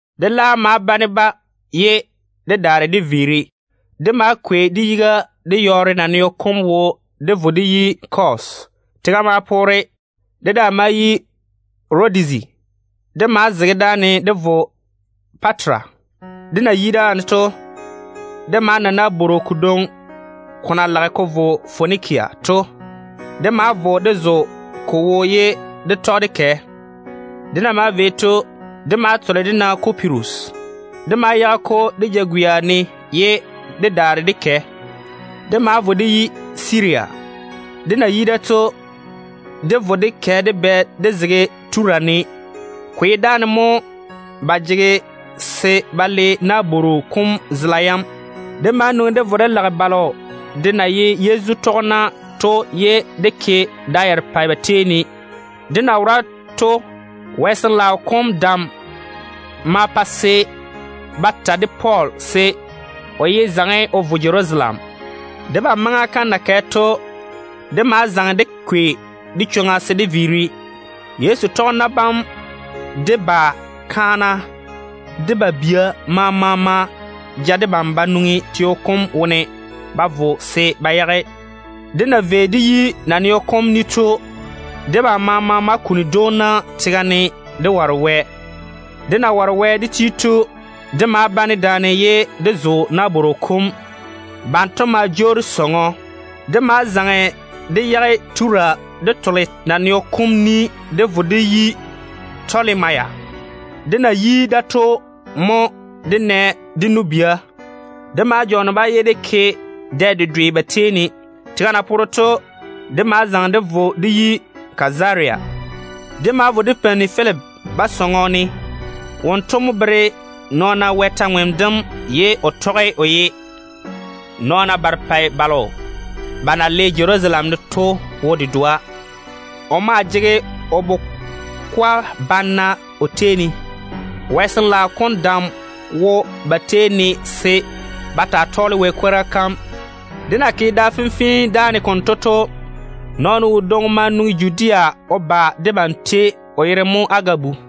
Dé laam ma bane-ba ye dé daare dé viiri. Dé ma kwei dé yiga dé yɔɔre naneo kom wo dé vo dé yi Kos. Tega ma poore. Dé daa ma yi Rodizi. Dé ma zege dáane dé vo Patara. Dé na yi dáane to, dé ma na nabworo kodwoŋi ko na lage ko vo Fonikia to. Dé ma vo dé zo ko wo ye dé tɔge dé kɛ. Dé na maa vei to, dé ma tole dé na Kupirus buburu kom. Dé ma yage-ko dé jagwia seeni ye dé daare dé kɛ. Dé ma vo dé yi Siria. Dé na yi da to, dé vo dé bɛ dé zege Tura ne. Ko ye dáane mo ba jege se ba le nabworo kom zela yam. Dé ma nwoŋi dé vo dé lage balo de na ye Yezu tɔgena to, ye dé ke da yarepɛ ba tei ne. Dé na wora to, Wɛ Sin-laao kom dam ma pa se ba ta de Pɔɔl se o yé zaŋe o vo Jerusalem. Debam maŋa kam na kɛ to, dé ma zaŋe dé kwei dé chwoŋa se dé viiri. Yezu nɔɔna bam, de ba kaana, de ba bia maama ma ja debam ba nwoŋi teo kom wone ba vo se ba yage. Dé na vei dé yi naneo kom ni to, debam maama ma kuni dwoona tega ne dé ware Wɛ. Dé na ware Wɛ dé ti to, dé ma bane daane ye dé zo nabworo kom. Banto ma jwoori sɔŋɔ. Dé ma zaŋe dé yage Tura dé tole naneo kom ni dé vo dé yi Tɔlemaya. Dé na yi da to, mo dé nɛ dé nu-bia. Dé ma jɔɔne-ba ye dé ke dɛ dedwe ba tei ne. Tega na poore to, dé ma zaŋe dé vo dé yi Kazaria. Dé ma vo dé peini Filipi ba sɔŋɔ ne. Wonto mo bere nɔɔna Wɛ kwor-ywoŋa kam ye o tɔge o ye nɔɔna barepɛ balo ba na le Jerusalem ne to wo dedoa. O maa jege o bukwa bana o tei ne. Wɛ Sin-laao kom dam wo ba tei ne se ba taa tɔɔle Wɛ kwora kam. Dé na ke da fenfee dáane konto to, Wɛ ni-jwoŋinu wodwoŋi ma nwoŋi Judea o ba debam tei. O yere mo Agabu.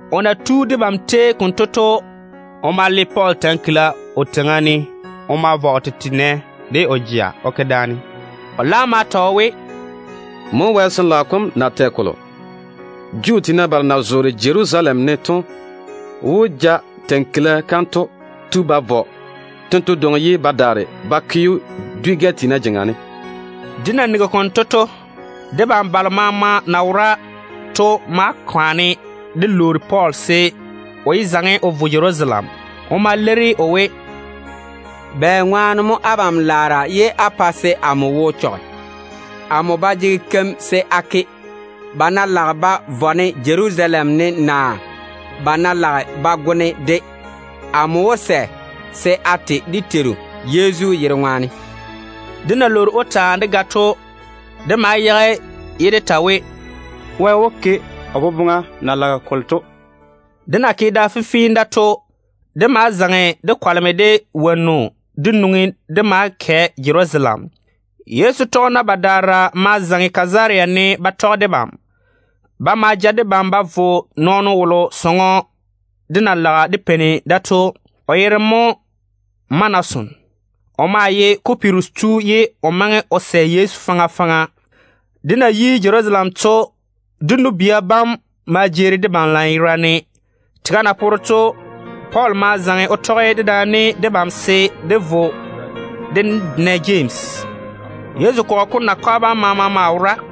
O na tu debam tei konto to, o ma le Pɔɔl kila o teiŋa ne o ma vɔ o tete nɛ de o jea o ke daane. O laam ma ta o we, “Mo Wɛ Sin-laao kom na tɛ kolo: Juu tiina balo na zoore Jerusalem ne to wó ja kila kanto tu ba vɔ tento dwoŋi, ye ba daare ba ke‑o dwi-gɛ tiina jeŋa ne.” Dé na nigi konto to, debam balo maama na wora to ma kwaane dé lwoori Pɔɔl se o daa yé vo Jerusalem. O ma leiri o we, “Bɛŋwaane mo abam laara ye á boŋe se á pa amo wo chɔge? Amo ba jege keim se a ke, ba ná lage ba vɔ-ne Jerusalem ne naa ba ná lage ba go-ne de. Amo wó sɛ se a te dé Teiru Yezu yere ŋwaane.” Dé na lwoori‑o taa dé ga to, dé ma yage ye dé ta we, “Wɛ wó ke o boboŋa na lage kolo to.” Dé na ke da fenfee da to, dé ma zaŋe dé kwaleme dé wonnu dé nwoŋi dé maa kɛ Jerusalem. Yezu tɔgena badaara ma zaŋe Kazaria ne ba tɔge debam. Ba ma ja debam ba vo nɔɔno wolo sɔŋɔ dé na lage dé peini da to. O yere mo Manason. O maa ye Kupirus tu ye o maŋe o sɛ Yezu faŋa faŋa. Dé na yi Jerusalem to, dé nu-bia bam ma jeeri debam lanyerane. Tega na poore to, Pɔɔl ma zaŋe o tɔge dedaane debam se dé vo dé na Jemsi. Yezu kɔgɔ kom nakwa bam de maama maa wora.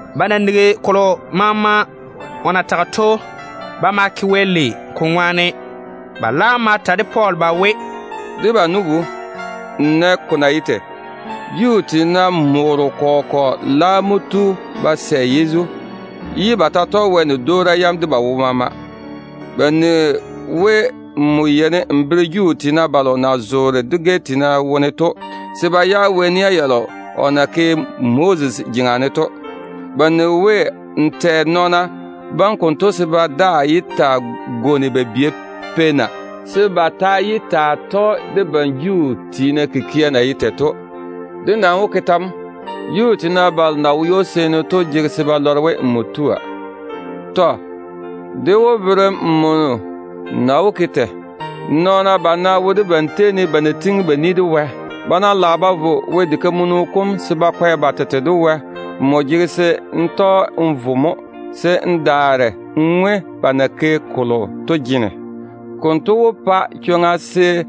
Ba na nigi kolo maama o na tage to, ba ma ke Wɛ lei ko ŋwaane. Ba laam ma ta de Pɔɔl ba we, “Debam nu-bu, n nɛ ko na ye tei. Juu tiina morro kɔgɔ kɔgɔ laam mo tu ba sɛ Yezu, ye ba ta tɔge Wɛ ni-dwoora yam de ba wo maama. Ba nigi we nmo yeini n bere Juu tiina balo na zoore dwi-gɛ tiina wone to se ba yage Wɛ nia yalo o na ke Moses jeŋa ne to. Ba nigi we n tɛ nɔɔna bam konto se ba daa yé taa gwoni ba bia peina, se ba ta yé taa tɔge debam Juu tiina kikia na ye tei to. Dé nam wó ke tɛ mo? Juu tiina balo na wo ywo-seeni to jege se ba lɔre we nmo tua. Tɔ. Dé wó bere‑m nmo na wó ke tei. Nɔɔna bana wo debam tei ne ba na tiŋi ba ni de Wɛ. Ba ná lage ba vo Wɛ diga kam se ba kwɛ ba tete de Wɛ, nmo jege se n tɔge n vo mo, se n daare n ŋwe ba na ke kolo to jene. Konto wó pa-ba chwoŋa se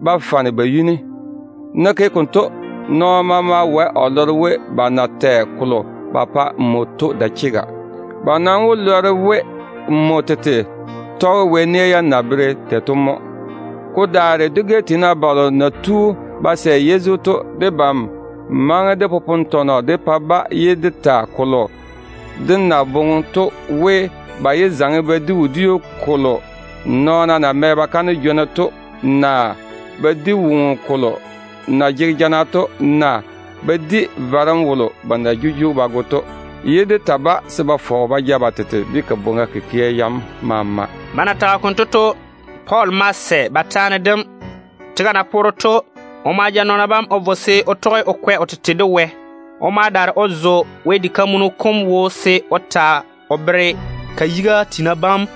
ba fane ba yuni. N ná ke konto, nɔɔno maama wae o lɔre we, ba na tɛ kolo ba pa nmo to dae chega. Ba nam wó lɔre we nmo tete tɔge Wɛ nia yam na bere tei to mo. Ko daare dwi-gɛ tiina balo na tu ba sɛ Yezu to, debam maŋe dé popone tɔnɔ dé pa-ba ye dé ta kolo dé na boŋe to we, ba yé zaŋe ba di wodiu kolo nɔɔna na mɛ ba kaane jwona to, naa ba di woŋo kolo na jege jana to, naa ba di varem wolo ba na jujugi ba go to. Dé daa ta ma ta-ba se ba fɔge ba ja ba tete de kabwoŋa kikia maama.” Pɔɔl ma sɛ ba taane dem. Tega na poore to, o ma ja nɔɔna bam o vo se o tɔge o kwɛ o tete de Wɛ. O ma daare o zo Wɛ diga kam se o ta o bere ka yiga tiina bam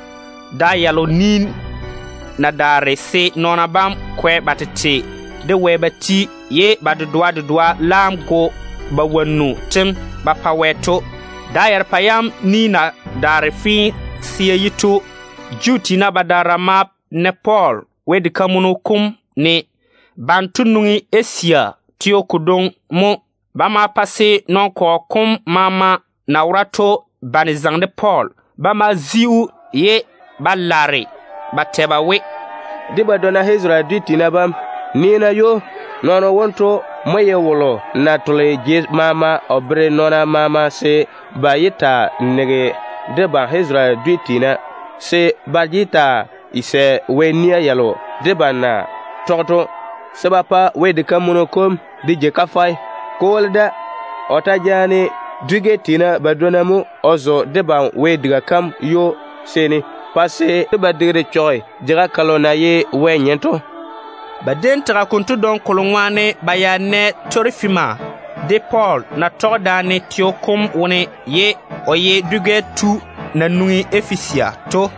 da yalo ni ta na daare se nɔɔna bam kwɛ ba tete de Wɛ ba ti, ye ba dedoa dedoa laam go ba wonnu ba kaane Wɛ to. Da yarepɛ yam ni na daare fee se ya ti to, Juu tiina badaara ma na Pɔɔl Wɛ diga kam wone. Banto nwoŋi Asia teo kodwoŋi mo. Ba ma pa se nɔn-kɔgɔ kom maama na wora to bane zaŋe de Pɔɔl pa se ba zi‑o. Ba ma laare ba ta ba we, “Dé badwonna Isarele dwi tiina bam, nii-na ywo! Nɔɔno wonto mo ye wolo na tole jei maama o bere nɔɔna maama se ba yé taa nege debam Isarele dwi tiina, se ba yé taa sɛ Wɛ nia yalo debam na tɔge to, se ba daare ba pa Wɛ diga kanto de ji kafɛ. Ko woli da, o ta jaane dwi-gɛ tiina badwonna mo o zo ywo-seeni pa se ba digiru chɔge jeiga kalo na ye Wɛ tete nyem to.” Ba déem tage konto dwoŋi kolo ŋwaane ba ya nɛ Torofima de Pɔɔl na tɔge daane teo kom wone ye o ye dwi-gɛ tu na nwoŋi Efesia to.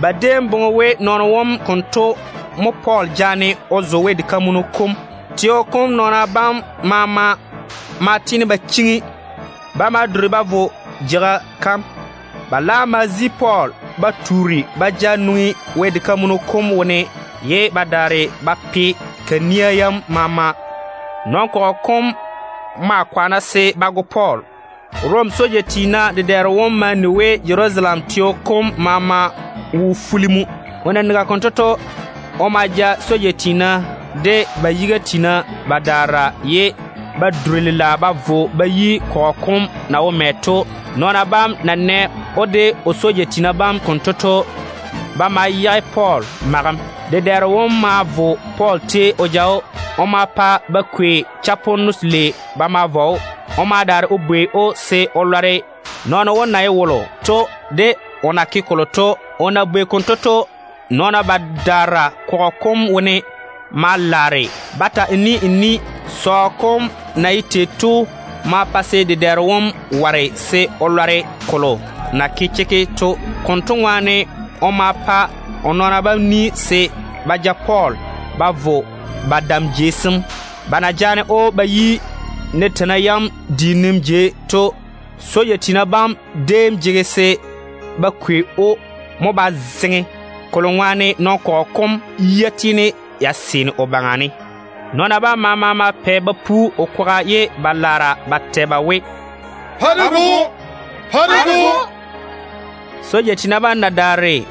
Ba déem boŋe we nɔɔno wom konto mo Pɔɔl jaane o zo Wɛ diga kam. Teo kom nɔɔna bam maama ma tiini ba chiŋi. Ba ma duri ba vo jeiga kam. Ba laam ma zi Pɔɔl ba tuuri ba ja nwoŋi Wɛ diga kam wone ye ba daare ba pe ka nia yam maama. Nɔn-kɔgɔ kom maa kwaana se ba go Pɔɔl. Rom soja tiina dedɛɛro wom ma ni we bobɔga to Jerusalem teo kom maama wone mo. O na nigi konto to, o ma ja soja tiina de ba yiga tiina badaara, ye ba duri lela ba vo ba yi kɔgɔ kom na wo mɛ to. Nɔɔna bam na nɛ‑o de o soja tiina bam konto to, ba ma yage Pɔɔl magem. Dedɛɛro wom ma vo Pɔɔl tei o ja‑o. O ma pa ba kwei chaponno telei ba ma vɔ‑o. O ma daare o bwei se o lɔre nɔɔno wom na ye wolo to de o na ke kolo to. O na bwei konto to, nɔɔna badaara kɔgɔ kom wone ma laare ba ta n ni n ni. Sɔɔ kom na ye tei to ma pa se dedɛɛro wom ware se o lɔre kolo na ke chekke to. Konto ŋwaane o ma pa o nɔɔna bam ni se ba ja Pɔɔl ba vo ba dam jei sem. Ba na jaane‑o ba yi nateina yam diinim jei to, soja tiina bam déem jege se ba kwei‑o mo ba zeŋe, kolo ŋwaane nɔn-kɔgɔ kom yia tiini ya seene o baŋa ne. Nɔɔna bam maama ma pɛ ba pu o kwaga ye ba laare ba tɛ ba we, “Pa-na dé go‑o!” Soja tiina bam na daare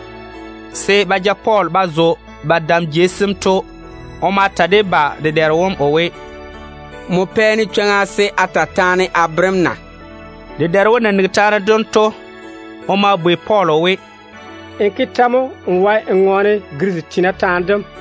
se ba ja Pɔɔl ba zo ba dam jei sem to, o ma ta de ba dedɛɛro wom o we, “A jege chwoŋa se a ta taane a bere‑m na?” Dedɛɛro wom na nigi taane dem to, o ma bwei Pɔɔl o we, “N ke tɛ mo n wae n ŋɔɔne Girisi tiina taane dem?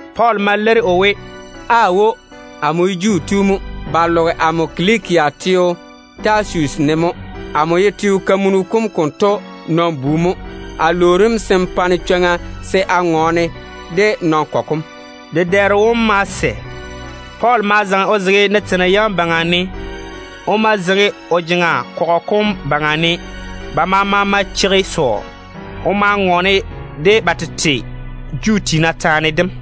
Pɔɔl ma leiri o we, “Aawo. Amo ye Juu tu mo. Ba loge amo Kilikia teo Tasusi ne mo. Amo ye teo kamunu kom konto nɔn-bu mo. A lwoori‑m se n pa-ne chwoŋa se a ŋɔɔne de nɔn-kɔgɔ kom.” Dedɛɛro wom ma sɛ. Pɔɔl ma zaŋe o zege nateina yam baŋa ne. O ma zeiŋi o jeŋa kɔgɔ kom baŋa ne. Ba maama ma cheigi sɔɔ. O ma ŋɔɔne de-ba de ba tete Juu tiina taane dem.